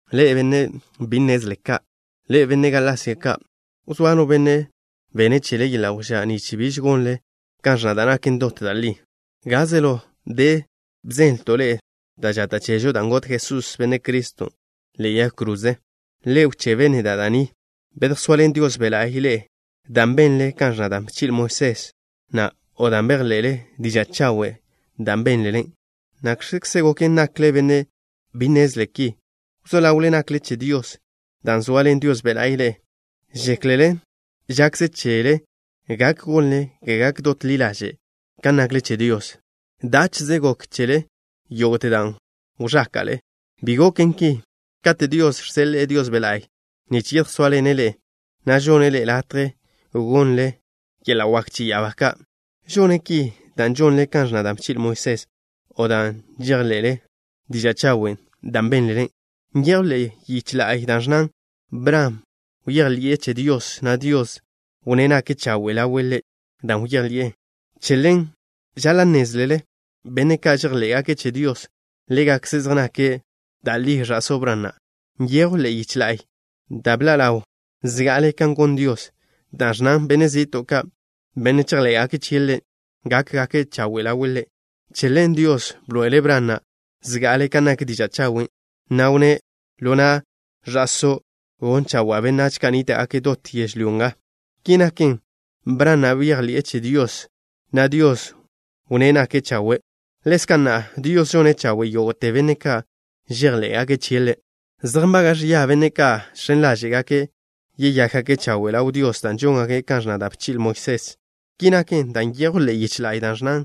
¡Ḻe'e, benne' bi nnezle ka'! ¡Ḻe'e, benne' Galasia ka'! ¿Wzóa no benne' bene' chele yeḻa' wžá' nich biž gonle kan ẕnna da' naken dot da' li? Gaze ḻo de bzenlto' ḻe'e da' žata' chežo dan' got Jesús, Benne' Criston', ḻe'e yag kroze. Le wchebe neda' da' ni. ¿Bedjsoaḻen Dios Be' La'y ḻe'e dan' benle kan ẕnna da' bchi'le Moisés na' o dan' bejḻe'le diža' chawen' da' bénlele? ¿Nakx̱kze goken nakle benne' bi nnezle ki? Wzó ḻawle nakle che Dios dan' zoaḻen Dios Be' La'y ḻe'e. ¿Žéklele žakze chele gak gonle ga gak dot ḻi ḻaže' kan nakle che Dios? ¿Dáche'ze gok chele yógo'te dan' wẕáka'le? ¡Bi goken ki! Kate' Dios žseḻe'e Dios Be' La'y nich yedjsóaḻene' ḻe'e, na' žonne' ḻe'e latje gonle yeḻa' wak che ya'abá ka', ¿žone' ki dan' žonle kan ẕnna da' bchi'le Moisés na' o dan' žejḻé'zele diža' chawen' da' bénlele? Nyejw ḻe'e yiche la'y da' ẕnnan: “Bran bejḻi'e che Dios, na' Dios wnné' nake' chawe' ḻawe' Ḻe' dan' bejḻi'e chie'.” Che ḻen žaḻa' nnézlele, benne' ka' žejḻé'gake' che Dios, ḻégakze' zej nake' da' li ẕa'só Bran na'. Nyejw ḻe'e yiche la'y, da' bḻa' ḻawn zga'ale kan gon Dios, dan' ẕnnan, benne' zi'to' ka', benne' chejḻé'gake' chie' Ḻe', gákgake' chawe' ḻawe' Ḻe'. Che ḻen Dios bḻoe'ele' Bran na' zga'ale kan nak diža' chawen', na' wnné': “Ḻo na' Ẕa'só' gon chawa'a benách ka' nníta'gake' dot yežlyó nga.” Ki naken, Bran na' bejḻi'e che Dios, na' Dios wnné' nake' chawe'. Ḻezka' na'a, Dios žone' chawe' yógo'te benne' ka' žejḻé'gake' chie' Ḻe'. Zej nbaga' ẕia benne' ka' žx̱en ḻáže'gake' yeyákgake' chawe' ḻaw Dios dan' žóngake' kan ẕnna da' bchi'le Moisés. Ki naken dan' nyejw ḻe'e yiche la'y da' ẕnnan: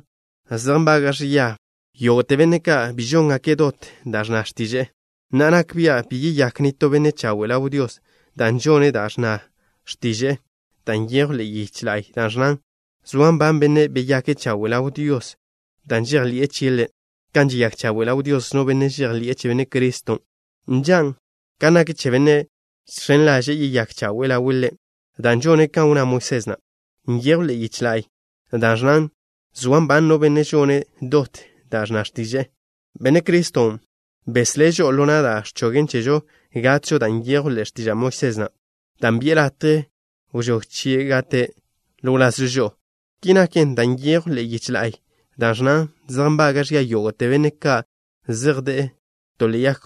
“Zej nbaga' ẕia yógo'te benne' ka' bi žóngake' dot da' ẕnna x̱tiže'e.” Na'a, nak bia' bi yeyák nitó benne' chawe' ḻaw Dios dan' žone' da' ẕnna x̱tiže'e, dan' nyejw ḻe'e yiche la'y da' ẕnnan: “Soa nban bennen' beyake' chawe' ḻaw Dios dan' žejḻi'e chie' Ḻe'.” Kan žeyák chawe' ḻaw Dios no benne' žejḻi'e che Benne' Criston' nžan' kan nak che benne' žx̱en ḻaže'e yeyake' chawe' ḻawe' Ḻe' dan' žone' kan wnná Moisés na'. Nyejw ḻe'e yiche la'y da' ẕnnan: “Soa nban no benne' žone' dot da' ẕnna x̱tiže'e.” Benne' Criston' beslé' žo'o ḻo na' da' ẕchogen chežo gatžo da' nyejwn ḻe'e x̱tiža' Moisés na', dan' bi'e latje wžóg chie' gate' ḻo wlazžo žo'o. Ki naken, dan' nyejw ḻe'e yiche la'y da' ẕnnan: “Zej nbaga' ẕia yógo'te benne' ka' zej de'e to ḻe'e yag.”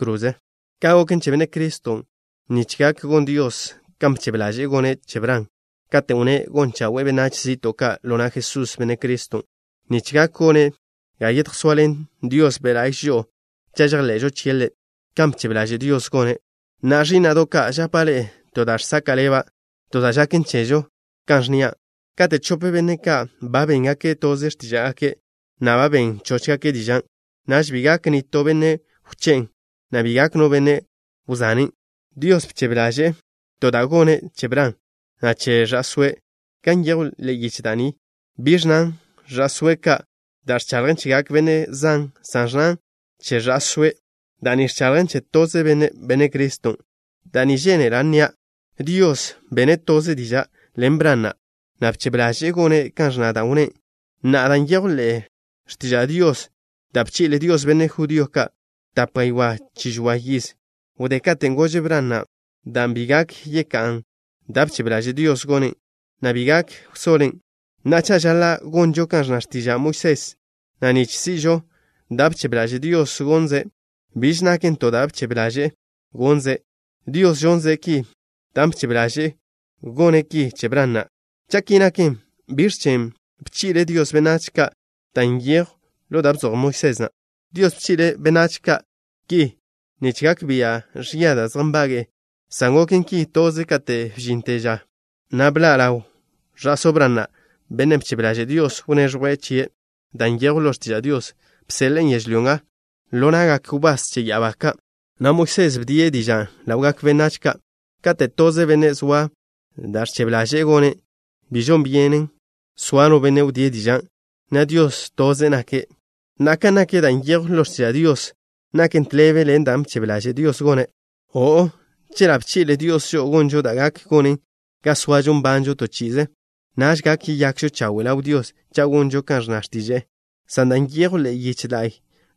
Ka' goken che Benne' Criston' nich gak gon Dios kan bchebe ḻaže'e gone' che Bran, katen' wnné' gon chawe'e benách zi'to' ka' ḻo na' Jesús, Benne' Criston', nich gak gone' ga yedjsoaḻen Dios Be' La'y žo'o cha' chejḻe'žo chie' Ḻe', kan bchebe ḻaže' Dios gone'. Na'a, ẕí'na'do' ka', žapa' ḻe'e to da' žsaka' ḻeba', to da' žaken chežo, na' ẕnnia': Kate' chope benne' ka' ba béngake' toze x̱tíža'gake', na' ba ben chóchgake' dižan', naž bi gak nitó benne' wché'en, na' bi gak no benne' wzanen'. Dios bchebe ḻaže'e to da' gone' che Bran, na' che Ẕa'sóe'. Gan nyejw ḻe'e yiche da' ni, bi ẕnnan: “ẕa'sóe' ka'”, da' ẕchaḻjen chegak benne' zan, san ẕnnan: “che Ẕa'sóe'.” Da' ni ẕchaḻjen che toze Benne', Benne' Criston'. Da' ni žénela' nnia': Dios bene' toze diža' ḻen Bran na', na' bchebe ḻaže'e gone' kan ẕnna da' wnné'. Na'a, da' nyejw ḻe'e x̱tiža' Dios, da' bchi'le Dios benne' judío ka' tape gaywá' chi žoa yiz wdé katen' gože' Bran na' dan', bi gak yeká'an dan' bchebe ḻaže' Dios gonen', na' bi gak wsoḻen. Na'a, cha' žaḻa' gonžo kan ẕnna x̱tiža' Moisés na' nich si'žo da' bchebe ḻaže' Dios gonze', biž naken to da' bchebe ḻaže'e gonze'. Dios žonze' ki dan' bchebe ḻaže'e gone' ki che Bran na'. Cha' ki naken, ¿biẕ chen' bchi'le Dios benách ka' da' nyejwn ḻo da' bzoj Moisés na'? Dios bchi'le' benách ka' ki nich gak bia' ẕia da' zej nbage'e, san goken ki toze kate' bžinte ža na' bḻa' ḻaw Ẕa'só Bran na', Bennen' bchebe ḻaže' Dios wneẕjwe' chie'. Da' nyejwn ḻo x̱tiža' Dios bseḻe'en yežlyó nga ḻo na'gak wbás che ya'abá ka', na' Moisés bdie' dižan' ḻawgak benách ka'. Kate' toze benne' zoa da' ẕchebe ḻaže'e gonen', bi žon byenen soa no benne' wdíe' dižan', na' Dios, toze' nake'. Na'a, kan nak da' nyejwn ḻo x̱tiža' Dios, ¿naken tḻebe ḻen dan' bchebe ḻaže' Dios gone'? O'o. Chela' bchi'le Dios žo'o gonžo da' gak gonen ga soažo nbanžo to chi'ize, naž gak yeyakžo chawe' ḻaw Dios cha' gonžo kan ẕnna x̱tiže'e. San da' nyejwn ḻe'e yiche la'y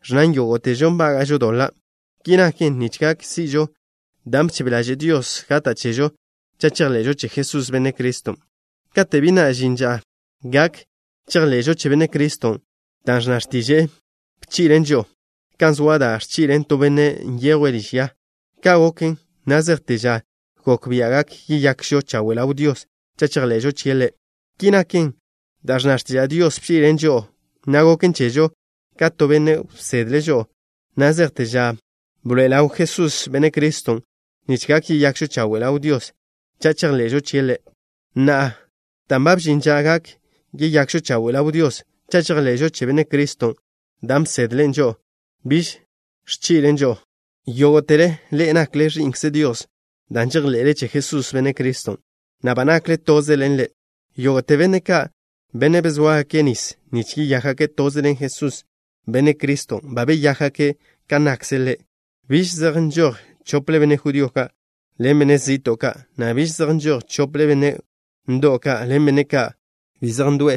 ẕnnan yógo'težo nbága'žo doḻa'. Ki naken nich gak si'žo dan' bchebe ḻaže' Dios gata' chežo cha' chejḻe'žo che Jesús, Benne' Criston'. Kate' bi na' žin ža gak chejḻe'žo che Benne' Criston', da' ẕnna x̱tiže'e bchi'len žo'o, kan zoa da' ẕchi'len to benne' nyejwe' liž ya. Ka' goken na' zejte ža gok bia' gak yeyakžo chawe' ḻaw Dios cha' chejḻe'žo chie' Ḻe'. Ki naken, da' ẕnna x̱tiža' Dios bchi'len žo'o, na' goken chežo ka to benne' bsedle' žo'o na' zejte ža bḻoe'e ḻaw Jesús, Benne' Criston', nich gak yeyakžo chawe' ḻaw Dios cha' chejḻe'žo chie' Ḻe'. Na'a, dan' ba bžin ža gak yeyakžo chawe' ḻaw Dios cha' chejḻe'žo che Benne' Criston', dan' bsedlen žo'o biž ẕchi'len žo'o. Yógo'tele ḻe'e nakle ẕi'nkze Dios dan' žejḻe'le che Jesús, Benne' Criston', na' ba nakle toze ḻen Ḻe'. Yógo'te benne' ka', benne' bezóagake' nis nich yeyákgake' toze ḻen Jesús, Benne' Criston', ba beyákgake' kan nakkze' Ḻe'. Biž zej nžoj chople benne' judío ka' ḻen benne' zi'to' ka', na' biž zej nžoj chople benne' ndo'w ka' ḻen benne' ka' bi zej ndo'e,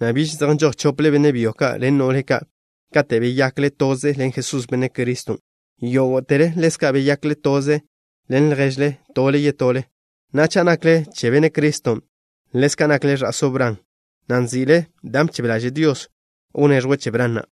na' biž zej nžoj chople benne' byo ka' ḻen no'le ka'. Kate' beyakle toze ḻen Jesús, Benne' Criston', yógo'tele ḻezka' beyakle toze ḻen lježle tole yetole. Na'a, cha' nakle che Benne' Criston', ḻezka' nakle ẕa'só Bran, na' nzi'le dan' bchebe ḻaže' Dios wneẕjwe' che Bran na'.